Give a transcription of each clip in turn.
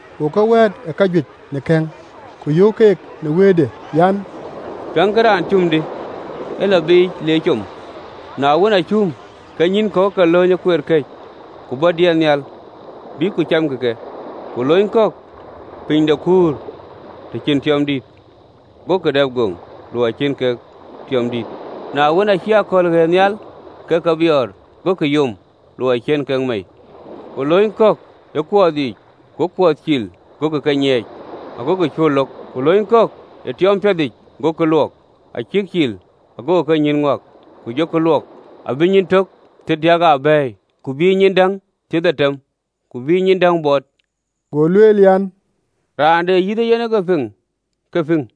Go ke wɛ̈ɛ̈t ë kajuëc në kɛ̈ŋ, ku yöök keek në wëëtde yic an, “Piɛŋkï: raan cum, dï, ë lɔ biic le com: na wën, aa cum, ke nyïïn kɔ̈k ë ke lööny ë kueer këc, ku bɔ̈ diɛt nhial bïkkï ku camkï ke. Ku lööny kɔ̈k piny de kuur, të cïn tiɔɔm dït, gokï dap goŋ ku në luɔi cïn en tiɔɔm dït. Na wën, aacï akɔ̈l ɣëët nhial, ke ke biɔɔr, gokï yom, luɔi cïn kek mei. Ku lööny kɔ̈k ë kuɔɔth yiic, go kuɔɔth cil, gokï ke nyiɛɛc, agokï cuö lok. Ku lööny kɔ̈k ë tiɔɔm piɛthic, gokï luɔk, acïk cil agokï kenyïïn ŋuak, ku jɔkï luɔk abï nyin tök thiërdiäk aa bɛ̈ɛ̈i, ku bïï nyin däŋ thiërdhetem, ku bïï nyin däŋ bɔt.” Go lueel an, “Raan de yïth ee yen ke piŋ, ke piŋ.”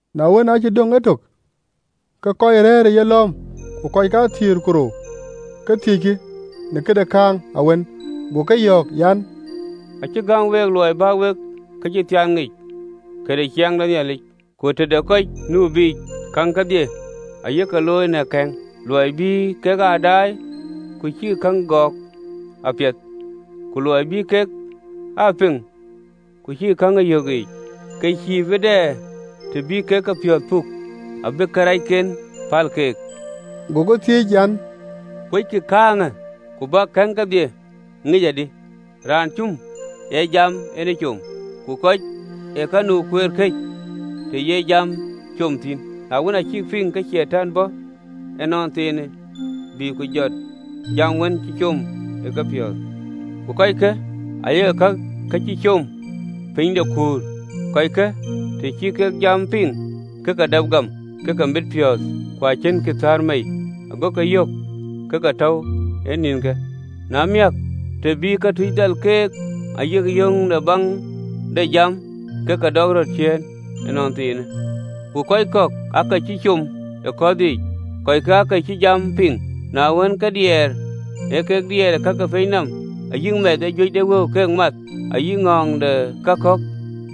Na wën, aacï döŋ etök, ke kɔc rɛ̈ɛ̈r ë yelɔ̈ɔ̈m ku kɔc kathiëër ku rou ke thiëckï në këde kääŋ awën. Go ke yɔ̈ɔ̈k an, “Acï gäm week luɔi bä wek këcïthiaan ŋic, këde ciɛɛŋ de Nhialic: ku tëde kɔc nu biic, käŋ kedhie aye ke looi në kɛ̈ŋ: (LXX). ‘luɔi bï kek aa daai, ku cïkï käŋ ë gɔɔk apiɛth, ku luɔi bï kek aa piŋ, ku cïkï käŋ ë yök yiic, ke cïï bï dɛ të bï kek kepiɔ̈ɔ̈th puk, abï karɛcken päl keek.”’ Go ke thiëëc an, “Kuöckï kääŋë? Ku bäk kɛ̈ŋ kedhie ŋic adï? Raan cum ee jam en com. Ku kɔc ee ka nu ë kueer këc, të ye jam com thïn, na wën, acïk piŋ, ke Catan bɔ̈ ënɔnthiinë, bï ku jɔt jam wën cï com ë kepiɔ̈ɔ̈th. Ku kɔckë aya ee ka cï com ë piny de kuur, kɔcke, të cï kek jam piŋ, ke ke dap gam ke ke mit piɔ̈ɔ̈th, ku acïnkï thäär mei, gokï yök ë ke tɔ̈u ë nïnkë, na miäk, të bï këtuc dhal keek ayï yöŋ në baŋ de jam, ke ke dɔk röt ciëën ënɔnthiinë. Ku kɔc kɔ̈k ee ka cï com ë kuɔɔth yiic, kɔckë ee kɔc cï jam piŋ, na wën, ke diɛɛr ee kek diɛɛr ë ka ke piny nɔm, ayï mɛth ee juëc de wëu keek math, ayï ŋɔ̈ɔ̈ŋ de ka kɔ̈k,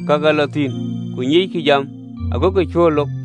ke ke lɔ thïn, ku nyiickï jam, agokï cuö lok.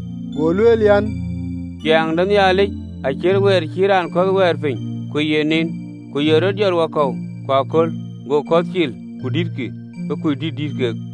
Go lueel an, “Ciɛɛŋ de Nhialic acït weer cï raan kɔ̈th wɛɛr piny, ku ye niin ku ye rɔt jɔt wakɔ̈u ku aköl, go kɔ̈th cil, ku dïtkï, ke kuc dït dïït kek.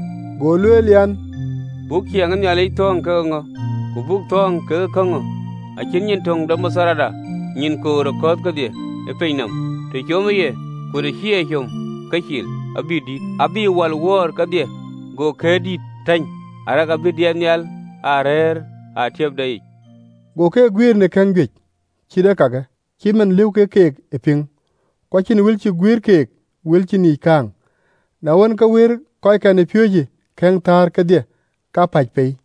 Go lueel an, “Buk ciɛɛŋ de Nhialic thɔ̈ɔ̈ŋ ke ŋö? Ku buk thɔ̈ɔ̈ŋ ë kääŋ ŋö? Acït nyin töŋ de matharda, nyin koor ë kɔ̈th kedhie ë piny nɔm, të comë ye, ku të cï e com, ke cil, abï dït, abï wal wöör kedhie, go këër dït tany, arëk abï diɛt nhial aa rëër e atiëpde yic.” Go keek aa guiëër në kɛ̈ŋ juëc cït ee kake, cït man lëu kek keek ë piŋ: ku acïn wël cï guiëër keek wël cïn yiic kääŋ: na wën, ke wëër kɔckɛn ë piööcë kɛ̈ŋ thäär kedhie kapäc pei.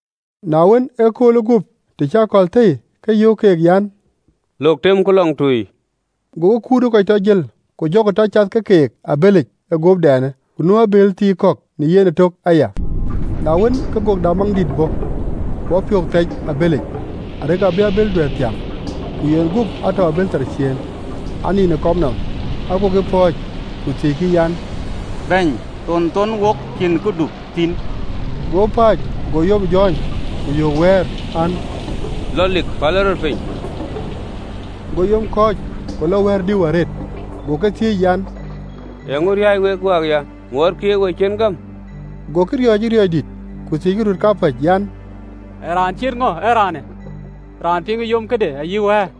Na wën, ëköölë guöp, të cï akɔ̈l thëi, ke yöök keek an, “Lok teemku lɔŋtui.” Gokï kut ë kɔc tɔ jël, ku jɔkï tɔ cath ke keek ë abëlic ë guöpdɛnë. Ku nu abëël thii kɔ̈k në yen ëtök aya. Na wën, ke gök de amaŋ dït bɔ̈, go apiöök thɛc ë abëlic, arëk abï abël duɛ̈ɛ̈r thiäŋ. Ku yen guöp atɔ̈u ë abël thar ciëën, anin ë kɔm nɔm: agokï pɔ̈ɔ̈c, ku thiëckï an, “Bɛ̈ny, thon thou wok cïn këdu thïn?” Go pääc, go yom jɔ̈ɔ̈ny, ku yöök wɛ̈ɛ̈r an, “Lɔ lik, pälë rɔt piny!” Go yom kɔ̈ɔ̈c, ku lɔ wɛ̈ɛ̈r dïu arëët. Go Yecu Kɔckɛn ëpiööcë thiëëc an, “Eeŋö riääc wek wäkya? Ŋuɔɔtkï ë we cïn gäm?” Gokï riɔ̈ɔ̈c ë riɔ̈ɔ̈c dït, ku thiëckï röt kapäc an, “Ee raan cït ŋö ee raanë, raan piŋë yom këde ayï wɛ̈ɛ̈r!”